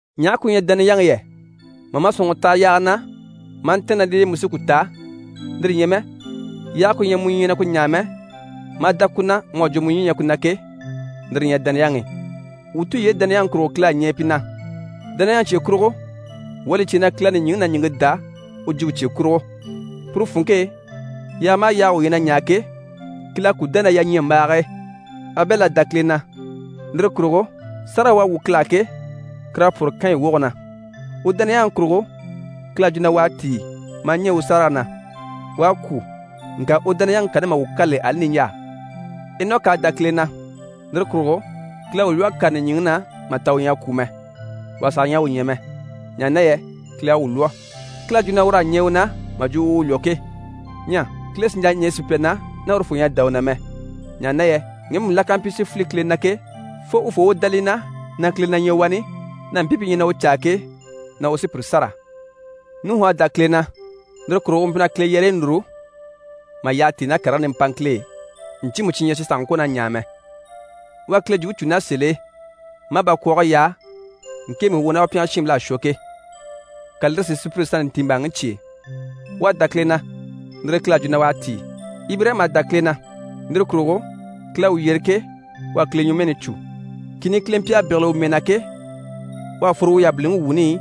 Ɲaha ku ɲyɛ dániyaŋi yɛ? Mà ma sɔ̀nŋɔre taha yaaga na maa ntɛ̀ɛn ná l'e mu sí ku ta, lire ɲyɛ mɛ yaage ku ɲyɛ mu ɲyɛ na ku ɲaa mɛ, maa dá ku na mu à jwo mu ɲyii na ɲyɛ ku na ke, lire li ɲyɛ dániyaŋi. Wuu tulyeyi dániyaŋi kurugo, Kile à ɲɛɛ pi na. Dániyaŋi cye kurugo, wuu à li cè na Kile à nìɲyiŋi ná ɲìŋke dá u jwumpe cye kurugo. Puru funŋke e, yaaga maha yaaga wuu ɲyɛ na ɲaa ke, Kile à ku dá ná yaɲyambaage e. Abɛli à dá Kile na, lire kurugo sárage u à wwû Kile á ke, kur'à pwɔ́rɔ Kanɲi woge na. U dániyaŋi kurugo, Kile à jwo na u à tíi maa ɲɛɛ u sárayi na. U à kwû, ŋka u dániyaŋi kani maha wuu kâlili ali niɲjaa. Enɔki à dá Kile na, lire kurugo Kile à u lwɔ́ a kàre nìɲyiŋi na mà ta u ɲyɛ a kwû mɛ. Wà saha ɲyɛ a u ɲya mɛ, ɲaha na yɛ Kile à u lwɔ́. Kile à jwo na ur'à ɲɛɛ u na, mà jwo u u lwɔ́ ke. Ɲyɛ Kile sì n‑jà ɲɛɛ sùpya na ná urufoo ɲyɛ a dá u na mɛ. Ɲaha na yɛ ŋgemu la ká mpyi si file Kile na ke, fo urufoo u dá li na na Kile na ɲyɛ wani, na mpii pi ɲyɛ na u caa ke, na u sí pire sâra. Nuhu à dá Kile na, lire kurugo u mpyi na Kile yɛrɛyi núru mà yyaha tíi ná karigii nimpaŋkil'e ɲcyiimu cyi ɲyɛ cyi sàha ŋkwɔ̀ na ɲaa mɛ. U à Kile jwumpe cû ná sèl'e, maa bakwɔɔge yaa ŋkemu i u ná u pyɛngɛ shiinbil'à shwɔ ke, ka lire si sùpyire sannte ntiimbaaŋi cyêe. U à dá Kile na, lire e Kile à jwo na u à tíi. Ibirayima à dá Kile na, lire kurugo, Kile à u yyere ke, u à Kile ɲwɔmɛɛni cû. Kìni Kile mpyi a bégele u mɛɛ na ke, u à fworo u yabiliŋi wuuni i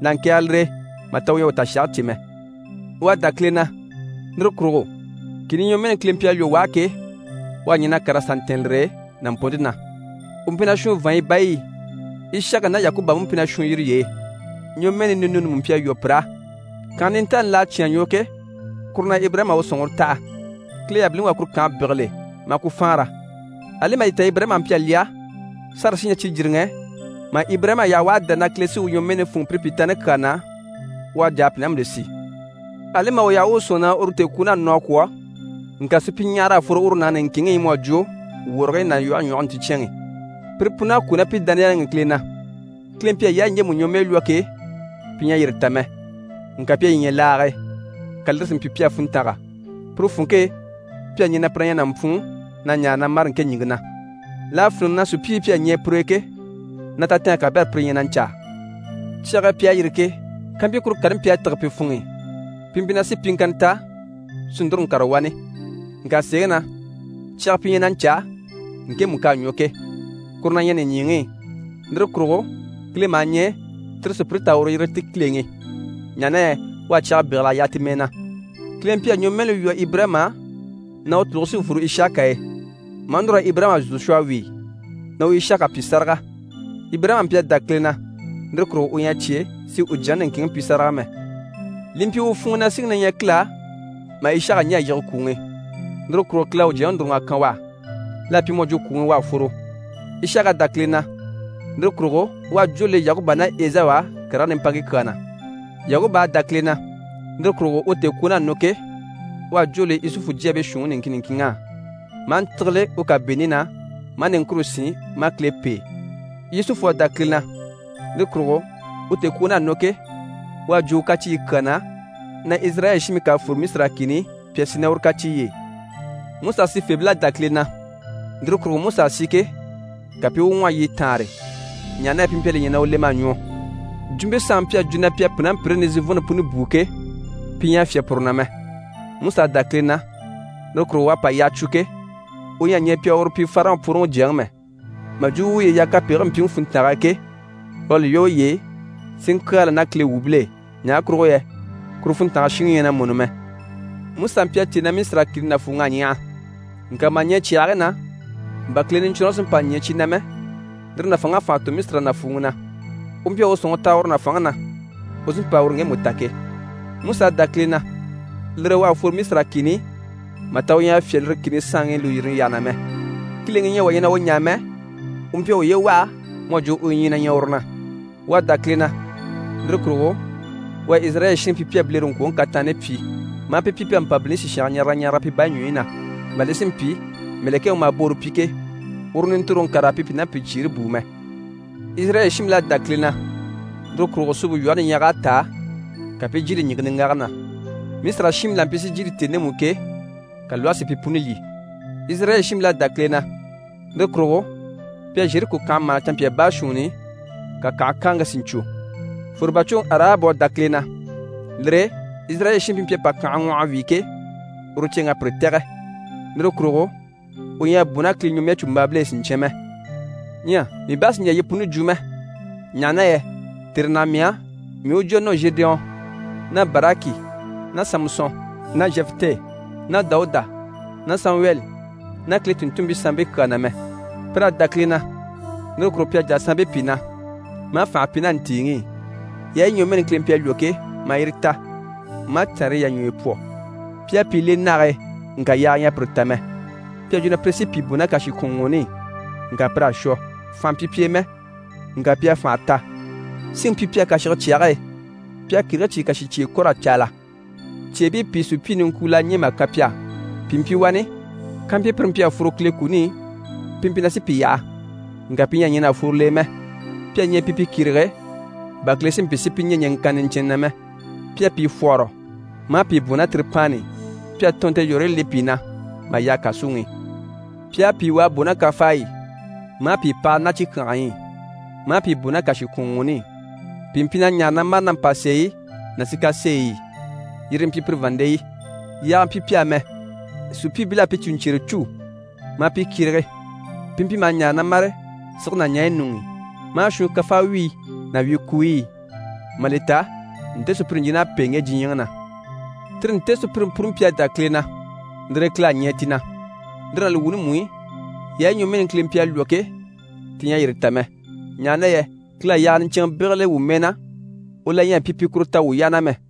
na ŋkɛ̀ɛge lire e, mà ta u ɲyɛ a u tashage cè mɛ. U à dá Kile na, lire kurugo kìni ɲwɔmɛɛni Kile mpyi a lwɔ́ u á ke, u à ɲɛn'a kàr'a sà ntɛ̀ɛn lire e nàmpɔnnte na. U mpyi na shwùun vàanɲyi bayi i. Ishaka ná Yakuba mú mpyi na shwùun yire y'e. Ɲwɔmɛɛni ninuuni mú mpyi a lwɔ́ pir'á. Kànhe nintaani l'à cyán a ɲwɔ ke, kuru na Ibirayima à u sɔ̀nŋɔre taha. Kile yabiliŋi u à kuru kànhe bégele, maa ku faanra. Ali mà li ta Ibirayima mpyi a lyɛ, Sara sí ɲyɛ cijiriŋɛ, mà Ibirayima yaha u à dá na Kile sí u ɲwɔmɛɛni fûnŋɔ pire pyìtaani kyaa na, u à jà a pùnambile si. Ali mà u yaha u u sɔ̂nŋi na uru tèekwuun'à nɔ a kwɔ̀, ŋka supyiɲyahara à fworo uru nàŋi niŋkinŋi i mu à jwo wɔrigii ná lwɔhe ɲwɔge nticɛnŋi. Pire pun'à kwû ná pi dániyaŋi i Kile na. Kile mpyi a yaayi ɲjemu ɲwɔmɛɛ lwɔ́ ke, pi ɲyɛ a yire ta mɛ, ŋka pi à yi ɲya laage e, ka lire si mpyi pi á funntanga. Puru funŋke e, pi à ɲɛɛ na pire na ɲyɛ nàmpwuun na ɲaare na mâre ŋke ɲìŋke na. L'à fíniŋɛ na sùpyiibii pi à ɲɛɛ pur'e ke, na tatɛɛnge kabɛrɛ pire ɲyɛ na ɲcaa. Cyage e pi à yîri ke, kàmpyi kuru kani mpyi a tîge pi funŋ'i, pi mpyi na sí pyiŋkanna ta si núru ŋkàre wani. Ŋka sèeŋi na, cyaga pi ɲyɛ na ɲcaa ŋkemu k'à ɲwɔ ke, kuru na ɲyɛ nìɲyiŋi i. Lire kurugo Kile maha ɲɛɛ tire sùpyire t'a uru yiri ti Kileŋi, ɲaha na yɛ u à cyaga bégel'a yaha ti mɛɛ na. Kile mpyi a ɲwɔmɛɛni lwɔ́ Ibirayima á na u tùluge sí n‑fworo Ishaka e, maa núr'a Ibirayima zò shwɔ a wíi na u Ishaka pyi sáraga. Ibirayima mpyi a dá Kile na, lire kurugo u ɲyɛ a cyé si u jyaŋi niŋkinŋi pyi sáraga mɛ. Li mpyi u funŋ'i na síŋi na ɲyɛ Kile á mà Ishaka ɲɛ̀ a yige kwùŋi i, lire kurugo Kile à u jyaŋi núruŋ'a kan u á. L'à pyi mu à jwo kwùŋi i u à fworo. Ishaka à dá Kile na, lire kurugo u à jwó le Yakuba ná Ezawu á karigii nimpaaŋkii kyaa na. Yakuba à dá Kile na, lire kurugo, u tèekwuun'à nɔ ke, u à jwó le Yusufu jyaabii shuunniŋi niŋkin niŋkinŋ'á, maa ntígile u kàbiini na, maa niŋkure sín, maa Kile pêe. Yusufu à dá Kile na, lire kurugo, u tèekwuun'à nɔ ke, u à jwo u kacyiiyi kyaa na, na Izirayɛli shiinbii ká a sí raa fwore Misira kìni i, pi a sì ná uru kacyiiy'e. Musa sifeebil'à dá Kile na, lire kurugo, Musa à si ke, ka pi i u ŋwɔhɔ yiɲyɛ taanre, ɲaha na yɛ pi mpyi a li ɲya na u lem'à ɲwɔ. Jwumpe saanŋi mpyi a jwo na pi a pùnampyire nizivɔnnte puni bùu ke, pi ɲyɛ a fyá puru na mɛ. Musa à dá Kile na, lire kurugo, u à pa yyaha cwo ke, u ɲyɛ a ɲɛɛ pi a uru pyi Farɔn pworoŋi jyaŋi mɛ. Mà jwo u uye yaha kapegigii mpyiŋi funntange e ke, u à li lwɔ́ uye e si ŋkyaala ná Kile shiinbil'e, ɲaha kurugo yɛ kuru funntange shiŋi ɲyɛ na mɔni mɛ. Musa mpyi a cè na Misira kìni nàfuuŋ'à ɲyaha, ŋka mà ɲɛɛ cyàhigii na, bà Kile Niɲcwɔnrɔŋi sí n‑pa ɲɛɛ cyi na mɛ, lire nàfanŋ'à fànha tò Misira nàfuuŋi na. U mpyi a u sɔ̀nŋɔre taha uru nàfanŋi na, u sí n‑pa uru ŋgemu ta ke. Musa à dá Kile na, lire e u à fworo Misira kìni i mà ta u ɲyɛ a fyá lire kìni saanŋi lùyirini yyaha na mɛ. Kileŋi u ɲyɛ wà ɲyɛ na u ɲaa mɛ, u mpyi a uye waha mu à jwo u ɲyii na ɲyɛ uru na. U à dá Kile na, lire kurugo u à Izirayɛli shiinbii pyi pi à bilereŋkwoŋi kataanni pyi, maa pi pyi pi à mpàbilini sìshange ɲaraga ɲaraga pi bayi ɲwɔyi na, bà li si mpyi mɛ̀lɛkɛŋi u maha boore pyi ke, uru nintoroŋi kà raa pi pùnampyicyiire bùu mɛ. Izirayɛli shiinbil'à dá Kile na, lire kurugo Suumpe Lwɔhe Niɲyage à táa, ka pi i jyiile ɲìŋke niŋgage na. Misira shiinbii la mpyi si jyiile tèni ndemu i ke, ka lwɔhe si pi puni lyî. Izirayɛli shiinbil'à dá Kile na, lire kurugo pi à Zheriko kànhe mâhana canmpyaa baashuunni i, ka kànhe káaŋke si ɲcwo. Fwòrobacwoŋi Arahabu à dá Kile na, lire e Izirayɛli shiinbii pi mpyi a pa kànhe ŋwɔh'a wíi ke, uru ceeŋ'à pire tɛ̀gɛ. Lire kurugo u ɲyɛ a bò ná Kile ɲwɔmɛɛcumbaabil'e siɲcyan mɛ. Ɲyɛ mii bá sì n‑jà yi puni jwo mɛ, ɲaha na yɛ tère naha mii á, mii i jwo a nɔ Zhedeyɔn ná Baraki ná Samusɔn ná Zhɛfitɛ ná Dawuda ná Samuwɛli ná Kile tùnntunmpii sanmpii kyaa na mɛ. Pir'à dá Kile na, lire kurugo pi à jà saanbii pìi na, maa fànhe pyi ná ntìiŋi i, yaayi ɲwɔmɛɛni Kile mpyi a lwɔ́ ke, maa yire ta, maa cànriyi yà ɲwɔyɔ pwɔ. Pi à pìi le nage e, ŋka yaaga ɲyɛ a pire ta mɛ. Pi à jwo na pire sí pìi bò ná kàshikwɔnŋwɔɔni i, ŋka pir'à shwɔ. Fànha mpyi pi e mɛ, ŋka pi à fànha ta. Síŋi mpyi pi á kàshige cyage e, pi à kìrigii cyìi kàshicyeye kɔ̀r'a caala. Cyeebii pìi sùpyii niŋkwul'à ɲɛ̀ mà kan pi á. Pìi mpyi wani, kampyi pire mpyi a fworo Kile kuni i, pi mpyi na sí pi yaha, ŋka pi ɲyɛ a ɲɛn'a fworo l'e mɛ. Pi à ɲɛɛ pi pi kyérege, bà Kile si mpyi si pi ɲɛ̀ ɲɛŋkanna niɲcɛnnɛ na mɛ. Pi à pìi fwɔ́hɔrɔ maa pi bwɔ̀n ná tiripaanni i. Pi à tɔɔnnte yɔ̀rɔyi le pi na mà yaha kàsuŋi i. Pi à pìi wà a bò ná kafaayi i, maa pìi pahala ná cikyangayi i, maa pìi bò ná kàshikwɔnŋwɔɔni i. Pìi mpyi na ɲaare na mâre ná mpàseeyi ná sikaseeyi i, yire yi mpyi pire vàanndeyi. Yaaga mpyi pi á mɛ. Sùpyiibil'à pi cùɲcyere cû maa pi kyérege. Pi mpyi maha ɲaare na mâre sige ná ɲaɲyi ɲuŋ'i, maa shwuun kafawyiyi ná wyikuuyi i, mà li ta nte sùpyire ɲjin'à pêe ŋge diɲyɛŋi na. Tire nte sùpyire puni mpyi a dá Kile na, lire e Kile à ɲɛɛ ti na. Lire ná li wuuni mú i, yaayi ɲwɔmɛɛni Kile mpyi a lwɔ́ ke, ti ɲyɛ a yire ta mɛ. Ɲaha na yɛ Kile à yaaga niɲcɛnŋɛ bégele wuu mɛɛ na, u la ɲyɛ a mpyi pi kuru ta a wuu yaha mɛ.